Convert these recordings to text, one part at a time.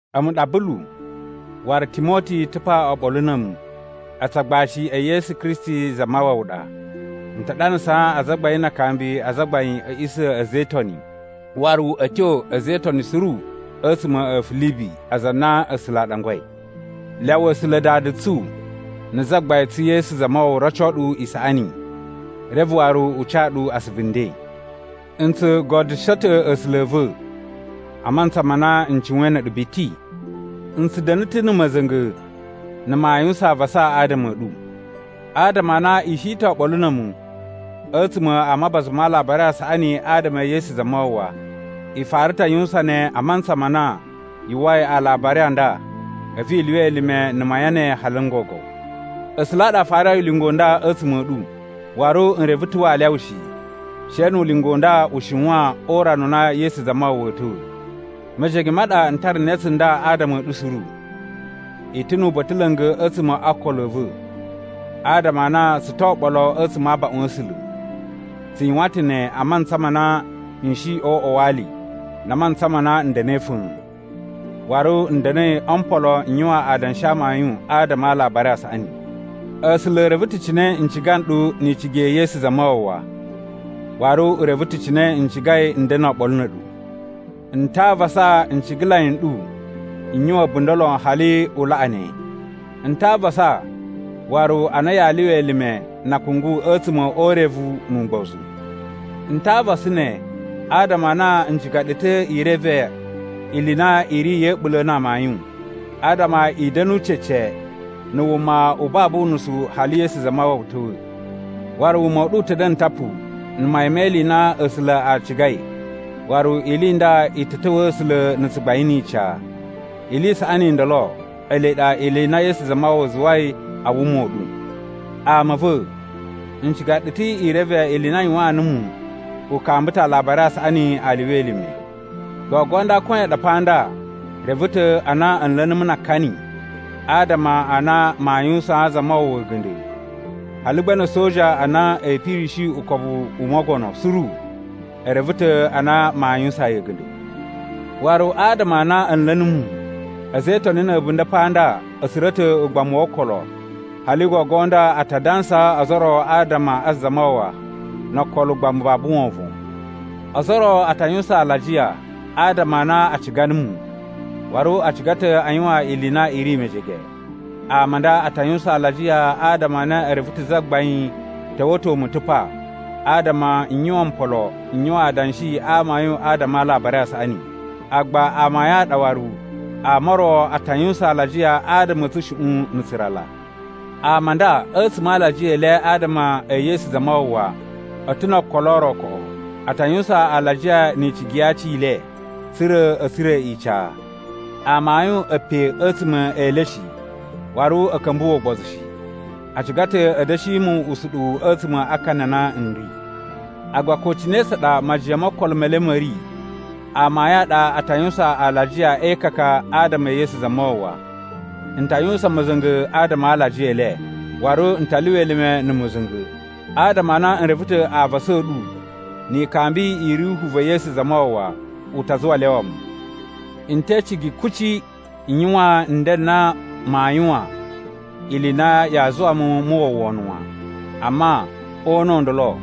A̱mu ɗa Bulu, waru Timoti ta̱ pa oɓolo na̱ a̱mu. A̱tsu agbashi e Yesu Kristi Zamawawa ɗa. N ta ɗanasaa azagbain na akambi a azagbain a̱ a̱a̱ꞌisa̱ a̱ a̱za̱ e Itoni, waru a̱ tyo a̱za̱ e Itoni suru a̱tsuma̱ a̱ Filibi aza a na A̱sula̱ a ɗangwai. Lyawa A̱sula̱ Dada tsu na̱ Zagbain tsu Yesu Zamawawa roco ɗu isaꞌani, reve waru u ca ɗu asuvu nden. N tsu godyusho ta̱ A̱sula̱ a̱ va̱ a mantsa ma na n cuwain na̱ a̱ɗu biti. N tsu da̱na̱ ta̱ na̱ ma̱za̱nga̱ na̱ maa yuwusan avasa adama a̱ ɗu. Adama a na i shi ta̱ oɓolo na̱ a̱mu a̱tsuma̱ a mabaza ma Alabari a Saꞌani adama e Yesu Zamawawa. I fara ta̱ a yuwusan ne a mantsa ma na yu uwwai alabari a nda a̱vu i lyuwa elime na̱ mayan ne hali n gogo. A̱sula̱ a ɗa a farai ulinga u nda a̱tsuma̱ a̱ ɗu, waru n reve ta̱ waa lyawa shi, she nu ulinga u nda u shiwan o urana u na Yesu Zamawawa a̱a̱ ta̱wa̱. Mejege ma ɗa n tara ne tsunda adama a̱ ɗu suru. I ta̱ nu uba̱ta̱ la̱nga̱ a̱tsuma̱ o okolo a̱ va̱ adama a na tsu to oɓolo a̱tsuma̱ a abaꞌun a̱ A̱sula̱. Tsu yuwan ta̱ ne a mantsa ma na n shi o uꞌwa wa ali na a mantsa ma na n da̱na̱i fa̱a̱n, waru n da̱na̱i o mpolo n yuwan adanshi a amayun adama a Alabari a Saꞌani. A̱sula̱ e reve ta̱ cine n ciga nɗu ni icigi ya̱ Yesu Zamawawa. Waru u reve ta̱ cine n cigai n da̱na̱ oɓolo na̱ a̱ɗu. N ta a avasa ncigalai n ɗu n yuwan a̱bunda̱ lon hali u laꞌa ne. N ta a avasa waru a na yaa lyuwa elime na akungu a̱tsuma̱ o urevu nu ugbozu. N ta a avasa ne adama a na n ciga ɗu ta̱ i reve ili i na i ri ya̱ a̱ɓula̱ na amayun, adama i da̱nu cece na̱ wuma u babu unusu hali Yesu Zamawawa ta̱wa̱. Waru wuma u ɗu u ta̱ da̱na̱ tapu na̱ mayan me ili i na A̱sula̱ a cigai waru ili i nda i ta̱ ta̱wa̱a̱ A̱sula̱ na̱ tsugbain ni ica. Ili i saꞌani i ndolo ele ɗa ili i na Yesu Zamawawa zuwai a wuma u ɗu. Ama a̱ va̱, n ciga ɗu ta̱ i reve ili i na a yuwaan numu u kamba ta̱ Alabari a Saꞌani a lyuwa elime. Gogo nda koyan ɗa pa nda reve ta̱ a na a̱ nla̱ numu na akani adama a na maa yuwusaan Zamawawa a̱ga̱nda̱. Hali gba na̱ a̱soja a na a̱a̱ pirishi ukobu u mogono suru e reve ta̱ a na maa yuwusaan yi a̱ga̱nda̱. Waru adama a na a̱ nla̱ numu, a̱za̱ e Itoni na̱ a̱bunda̱ pa nda a̱ tsura̱ ta̱ ugbamu wo okolo hali gogo nda a ta dansaa ozo o ro adama a Zamawawa no okolo ugbamu babu wovon. Ozo o ro a ta yuwusan alajiya adama a na a ciga numu, waru a ciga ta̱ a yuwan ili i na i ri mejege. Ama a nda a ta yuwusan alajiya adama a na e reve ta̱ Zagbain ta̱wa̱to mu ta̱ pa adama n yuwan mpolo n yuwan adanshi a amayun adama a Alabari a Saꞌani. Agba amayun a ɗa waru ama o ro a ta yuwusan alajiya adama a̱ tsushuꞌun na̱ tsurala. Ama a nda a̱tsuma̱ a alajiya e le adama e Yesu Zamawawa, a̱ ta̱ no okolo o ro koꞌo. A ta yuwusan alajiya ni icigi ya aci i le tsa̱ra̱ a̱ tsura̱ ica. Amayun a̱ pe a̱tsuma̱ e le shi waru a̱ ka̱mbuwa̱ ugbozu shi. A ciga ta̱ a̱ da̱shi mu usuɗuwu a̱tsuma̱ a akani a na n ri. Agba ko cine tsa ɗa majiyan mo okolo me le ma̱ ri, amayun a ɗa a ta yuwusan alajiya e ikaka adama e Yesu Zamawawa. N ta yuwusan ma̱za̱nga̱ adama a alajiya e le. Waru n ta lyuwa elime na̱ ma̱za̱nga̱ adama a na n reve ta̱ avasa a̱ ɗu ni ikambi i Ruhu va̱ Yesu Zamawawa u ta zuwa a lyawa mu. N te icigi kuci n yuwan nden n na maa yuwan ili i na yaa zuwa mu mu uwwa wono wan, amma o una̱ u ndolo,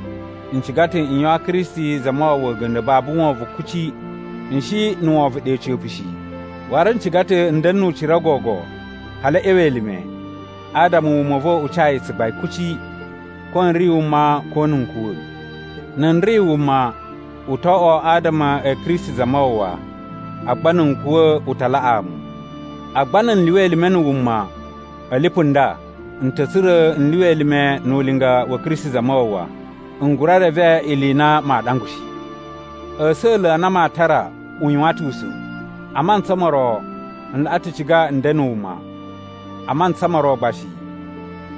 n ciga ta̱ n yuwaan Kristi Zamawawa a̱ga̱nda̱ babu wovon kuci. N shi na̱ wovon ɗe a̱ca̱pa̱ shi, waru n ciga ta̱ n da̱na̱ nu ucira gogo hali a̱ ꞌya̱wa̱ elime adama wuma u va̱ u ca yi tsugbain kuci, ko n ri wuma ko na̱ n kuwa̱. Na̱ n ri wuma, u to oꞌwo adama a̱ Kristi Zamawawa, agba na̱ n kuwa̱ u ta laꞌaa mu. Agba na̱ n lyuwa elime na̱ wuma a̱ lipu nda, n ta̱ tsura̱ n lyuwa elime nu ulinga wa̱ Kristi Zamawawa. N gura reve ili i na maa ɗangwa shi. A̱sa̱la̱ a na maa tara u yuwan ta̱ usa̱n. A mantsa mo ro n laꞌa ta̱ ciga n da̱na̱ wuma, a mantsa mo ro gba shi,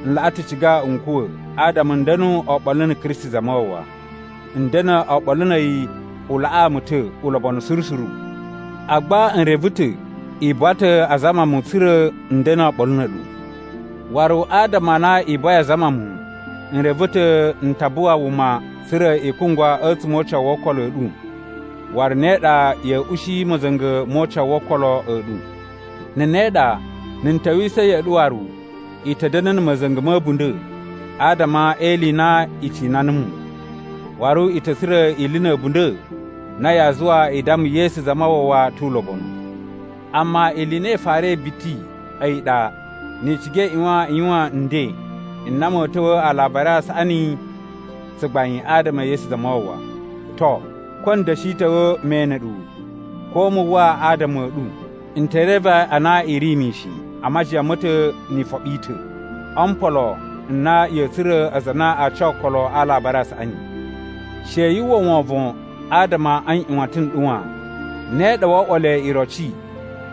n laꞌa ta̱ ciga n kuwa̱ adama n da̱nu oɓolo na̱ Kristi Zamawawa. N da̱na̱ oɓolo na̱ a̱yi u laꞌaa mu ta̱ ulobonu suru suru. Agba n reve ta̱ i buwa ta̱ a zama mu tsa̱ra̱ n da̱na̱ oɓolo na̱ a̱ɗu. Waru adama a na i buwai a zama mu, n reve ta̱ n ta buwa wuma tsa̱ra̱ i kungwa a̱tsuma̱ o ucawu wo okolo a̱ ɗu waru ne ɗa ya̱a̱ ushi ma̱za̱nga̱ mo ucawu wo okolo a̱ ɗu. Na̱ ne ɗa, na̱ n ta̱wisa̱ ya̱ꞌa̱ ɗu waru, i ta̱ da̱na̱ na̱ ma̱za̱nga̱ ma̱ a̱bunda̱ adama e ili i na i cina numu, waru i ta̱ tsura̱ ili na̱ a̱bunda̱ na yaa zuwa i damma Yesu Zamawawa tu ulobonu. Amma ili i na i farai biti, a̱yi ɗa, ni i ciga i ꞌyuwan i yuwan nden n na ma̱a̱ ta̱wa̱a̱ Alabari a Saꞌani tsugbain adama e Yesu Zamawawa. To, ko n da̱shi ta̱wa̱ me ene ɗu ko mu uwwa adama a̱ ɗu, n te reve a na i ri mishin a majiyan ma̱ ta̱ ni ifoɓi i ta̱, o mpolo n na ya̱a̱ tsura̱ aza a na aa ca okolo a Alabari a Saꞌani. She yu uwwa wovon adama a nꞌyuwatan n ɗu wan. Ne ɗa woo oꞌwo le iroci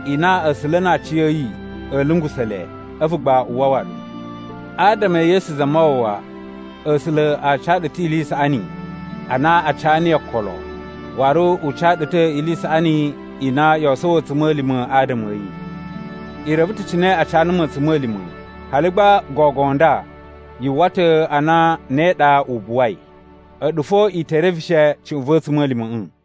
i na A̱sula̱ na aciya̱yi a̱a̱ lungusa̱ le a̱vu gba u wawa ɗu. Adama e Yesu Zamawawa, A̱sula̱ a ca ɗu ta̱ ili i saꞌani a na a ca niyi okolo, waru u ca ɗu ta̱ ili i saꞌani i na yoo sowo a̱tsuma̱lima̱ adama a̱ yi. I reve ta̱ cine a ca numu a̱tsuma̱lima̱ hali gba gogo nda yu uwwa ta̱ a na ne ɗa u buwai. A̱ɗu fo i te reveshe cuꞌun va̱ a̱tsuma̱lima̱ꞌa̱.